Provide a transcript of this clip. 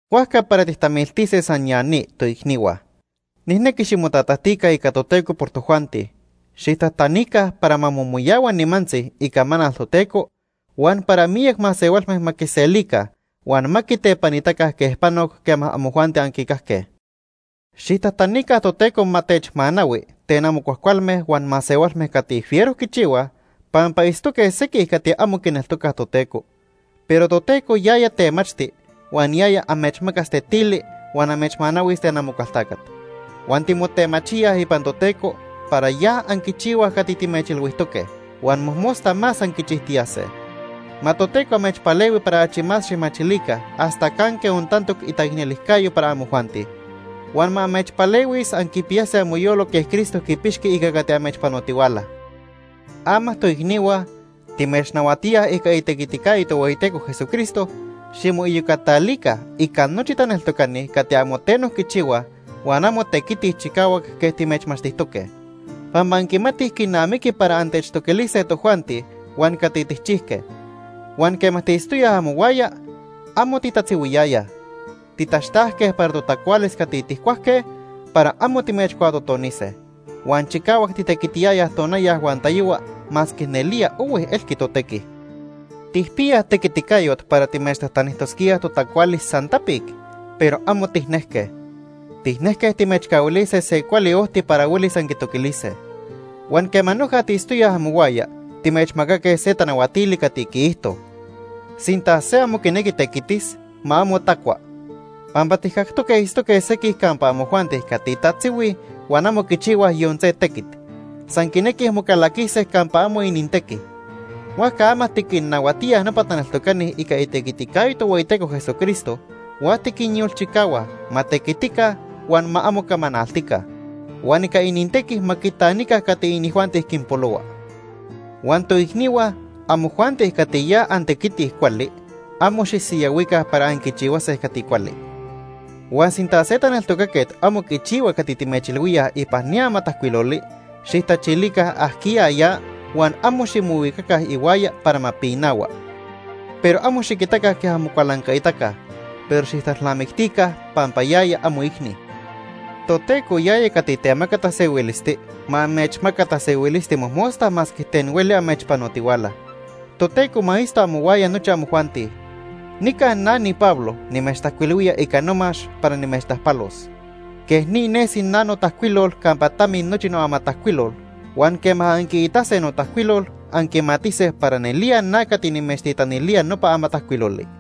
Huajca para tijtamiltise san ya ni, toicnihua. Nijnequi ximotatajtica ica Toteco por tojuanti. Xijtajtanica para ma momoyahua nimantzi icamanal Toteco huan para miyac masehualme ma quiselica huan ma quitepanitaca quej panoc quema amojuanti anquicajque. Xijtajtanica Toteco ma techmanahui ten amo cuajcualme huan masehualme cati fiero quichihuaj, pampa itztoque sequij cati amo quineltocaj Toteco. Pero Toteco yaya temachti huan yaya amechmacas tetili huan amechmanahuis ten Amocualtacat. Huan timotemachíaj ipan Toteco para ya anquichihuaj cati timechilhuijtoque, huan mojmosta más anquichijtiyase. Ma Toteco amechpalehui para achi más xijmachilica hasta canque ontantoc itaicnelijcayo para amojuanti. Huan ma amechpalehuis anquipiyase amoyolo quej Cristo quipixqui ica cati amechpanotihuala. Ama toicnihua, timechnahuatíaj ica itequiticayo Tohueyiteco Jesucristo, ximoiyocatalica ica nochi taneltocani cati amo teno quichihuaj huan amo tequitij chicahuac quej timechmachtijtoque. Pampa anquimatij quinamiqui para antechtoquilise tojuanti huan cati tijchijque. Huan quema tiitztoyaj amohuaya, amo titatzihuiyayaj. Titaxtajque para totacualis cati tijcuajque para amo timechcuatotonise. Huan chicahuac titequitiyayaj tonaya huan tayohua masque nelía ohui elqui totequi. Tijpiyaj tequiticayot para timechtajtanijtosquíaj totacualis san tapic, pero amo tijnequiyayaj. Tijnejque timechcahuilise se cuali ojti para huelis anquitoquilise. Huan quema noja tiitztoyaj amohuaya timechmacaque se tanahuatili cati quiijto: Sinta se amo quinequi tequitis, ma amo tacua. Pampa tijcactoque itztoque sequij campa amojuanti cati tatzihuij huan amo quichihuaj yon se tequit. San quinequij mocalaquise campa amo inintequi. Huajca ama tiquinnahuatíaj nopa taneltocani ica itequiticayo Tohueyiteco Jesucristo huan tiquinyolchicahua ma tequitica huan ma amo camanaltica. Huan ica inintequi ma quitanica cati inijuanti quinpolohua. Huan toicnihua, amojuanti cati ya antequitij cuali, amo xisiyahuica para anquichihuase cati cuali. Huan sinta se taneltocaquet amo quichihua cati timechilhuíaj ipan ni amatajcuiloli, xijtachilica ajquiya ya huan amo ximohuicaca ihuaya para ma pinahua. Pero amo xiquitaca quej amocualancaitaca, pero xijtalnamictica pampa yaya amoicni. Toteco, yaya cati temaca tasehuilisti, ma amechmaca tasehuilisti mojmosta masque ten hueli amechpanotihuala. Toteco ma itzto amohuaya nochi amojuanti. Nica na niPablo nimechtajcuilhuía ica nomax para nimechtajpalos. Quej ni nesi na notajcuilol campa tamis nochi noamatajcuilol, huan quema anquiitase notajcuilol, anquimatise para nelía na cati nimechtitanilía nopa amatajcuiloli.